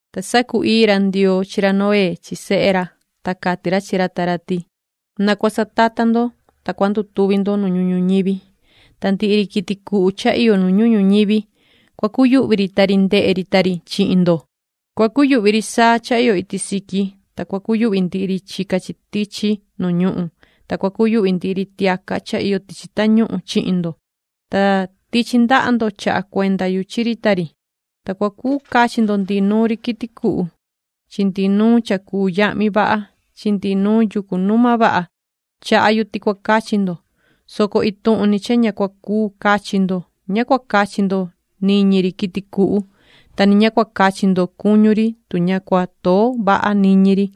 Ta sacu-ii ra Ndioo chi ra Noé chi sehe ra, ta cati ra chi ra ta ra ti: “Na cua satata ndo, ta cua ndutuvi ndo nu ñuhun ñuñivi. Ta ndihi ri quiti cuhu cha iyo nu ñuhun ñuñivi, cua cuyuhvi ri ta ri ndehe ri ta ri chihin ndo. Cua cuyuhvi ri saa cha iyo iti siqui, ta cua cuyuhvi ndihi ri chica chi tichi nu ñuhun, ta cua cuyuhvi ndihi ri tiaca cha iyo tichi tañuhun chihin ndo. Ta tichi ndaha ndo chaha cuenda yu chi ri ta ri. Ta cua cuu cachi ndo ndihi nuun ri quiti cuhu chi ndihi nuun cha cuu yahmi vaha chi ndihi nuun yucu numa vaha, chaha yu ti cua cachi ndo, soco ituhun ni cha ña cua cuu cachi ndo. Ña cua cachi ndo niñi ri quiti cuhu, ta ni ña cua cachi ndo cuñu ri tu ña cua too vaha niñi ri,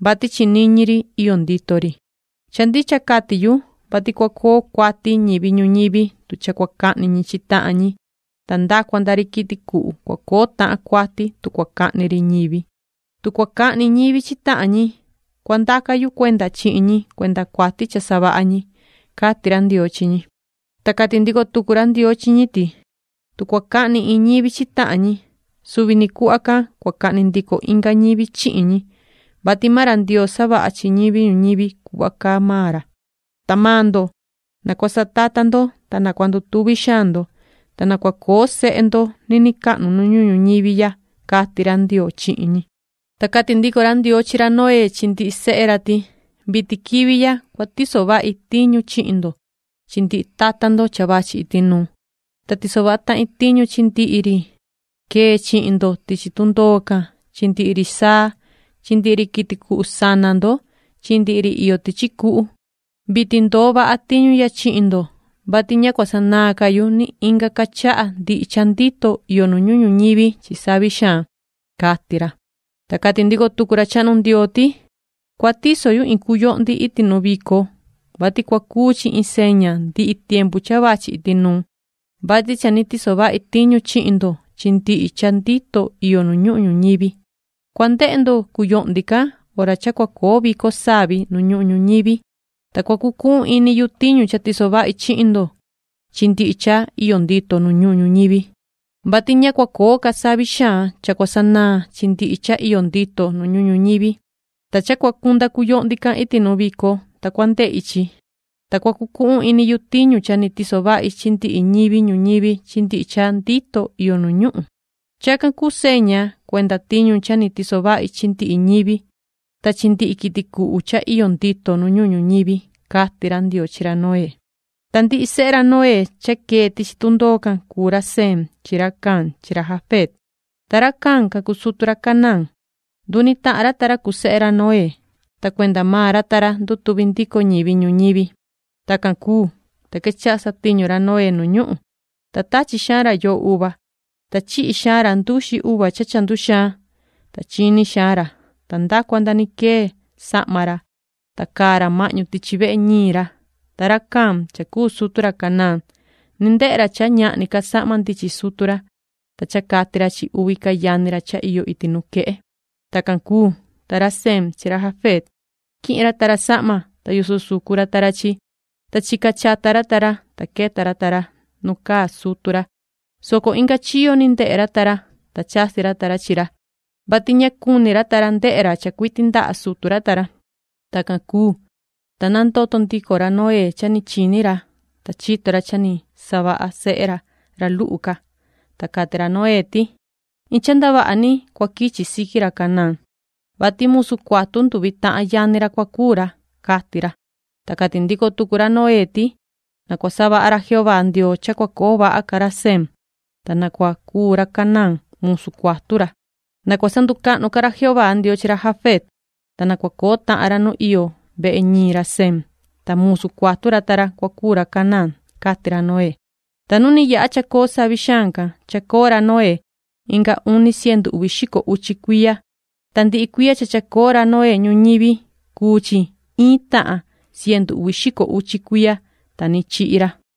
vati chi niñi ri iyo ndito ri. Cha ndicha cati yu, vati cua coo cuati ñivi ñuñivi tu cha cua cahni ñi chi tahan ñi, ta nda cua nda ri quiti cuhu cua coo tahan cuati tu cua cahni ri ñivi. Tu cua cahni ñivi chi tahan ñi, cua ndaca yu cuenda chihin ñi cuenda cuati cha savaha ñi”, cati ra Ndioo chi ñi. Ta cati ndico tucu ra Ndioo chi ñi ti: “Tu cua cahni iin ñivi chi tahan ñi, suvi ni cuhva can cua cahni ndico inga ñivi chihin ñi, vati maan ra Ndioo savaha chi ñivi ñuñivi cuhva caa maan ra. Ta maan ndo, na cua satata ndo, ta na cua ndutuvi xaan ndo, ta na cua coo sehe ndo niniin cahnu nu ñuhun ñuñivi ya”, cati ra Ndioo chihin ñi. Ta cati ndico ra Ndioo chi ra Noé chi ndihi sehe ra ti: “Vitin quivi ya cua tiso vahi tiñu chihin ndo chi ndihi tata ndo cha vachi iti nuu. Ta tiso vaha tahin tiñu chi ndihi ri quee chihin ndo tichi tundoo can chi ndihi ri saa chi ndihi ri quiti cuhu sana ndo chi ndihi ri iyo tichi cuhu. Vitin ndoo vaha tiñu ya chihin ndo, vati ña cua sanaan ca yu ni inga ca chaha ndihi cha ndito iyo nu ñuhun ñuñivi chi savi xaan”, cati ra. Ta cati ndico tucu ra chahnu Ndioo ti: “Cua tiso yu iin cuyohndi iti nu vico, vati cua cuu chi iin seña ndihi tiempu cha vachi iti nuu, vati cha ni tiso vahi tiñu chihin ndo chi ndihi cha ndito iyo nu ñuhun ñuñivi. Cua ndehe ndo cuyohndi can hora cha cua coo vico savi nu ñuhun ñuñivi. Ta cua cucuhun ini yu tiñu cha tiso vahi chihin ndo chi ndihi cha iyo ndito nu ñuhun ñuñivi, vati ña cua coo ca savi xaan cha cua sanaan chi ndihi cha iyo ndito nu ñuhun ñuñivi. Ta cha cua cunda cuyohndi can iti nu vico, ta cua ndehi chi, ta cua cucuhun ini yu tiñu cha ni tiso vahi chi ndihi ñivi ñuñivi chi ndihi cha ndito iyo nu ñuhun. Chacan cuu seña cuenda tiñu cha ni tiso vahi chi ndihi ñivi, ta chi ndihi quiti cuhu cha iyo ndito nu ñuhun ñuñivi”, cati ra Ndioo chi ra Noé. Ta ndihi sehe ra Noé cha quee tichi tundoo can, cuu ra Sem chi ra Cam chi ra Jafet, ta ra Cam can cuu sutu ra Canaán. Nduni tahan ra ta ra cuu sehe ra Noé, ta cuenda maan ra ta ra ndutuvi ndico ñivi ñuñivi. Tacan cuu, ta quechaha satiñu ra Noé nu ñuhun, ta tachi xaan ra yoho uva. Ta chihi xaan ra nduxi uva cha cha nduxaan, ta chini xaan ra, ta nda cua ni quee sahma ra, ta caa ra mahñu tichi vehe ñiin ra. Ta ra Cam cha cuu sutu ra Canaán, ni ndehe ra cha ñahni ca sahma ndichin sutu ra, ta cha cati ra chi uvi ca yani ra cha iyo iti nuquehe. Tacan cuu, ta ra Sem chi ra Jafet quihin ta ra sahma, ta yoso sucu ra ta ra chi, ta chica chata ra ta ra, ta queta ra ta ra nu caa sutu ra, soco inga chiyo ndehe ra ta ra, ta chasi ra ta ra chi ra, vati ña cuni ra ta ra ndehe ra cha cuiti ndaha sutu ra ta ra. Tacan cuu, ta nandoto ndico ra Noé cha ni chini ra, ta chito ra cha ni savaha sehe ra, ra luhu ca, ta cati ra Noé ti: “Iin cha ndavaha ni cua quichi siqui ra Canaán, vati musu cuatu nduvi tahan yani ra cua cuu ra”, cati ra. Ta cati ndico tucu ra Noé ti: “Na cua savaha ra Jehová Ndioo cha cua coo vaha ca ra Sem, ta na cua cuu ra Canaán musu cuatu ra. ¡Na cua sanducahnu ca ra Jehová Ndioo chi ra Jafet, ta na cua coo tahan ra nu iyo vehe ñiin ra Sem, ta musu cuatu ra ta ra cua cuu ra Canaán!”, cati ra Noé. Ta nu ni yaha chacoo savi xaan can, chacoo ra Noé inga uni cientu uvi xico uchi cuiya. Ta ndihi cuiya cha chacoo ra Noé ñuñivi, cuu chi iin tahan cientu uvi xico uchi cuiya, ta ni chihi ra.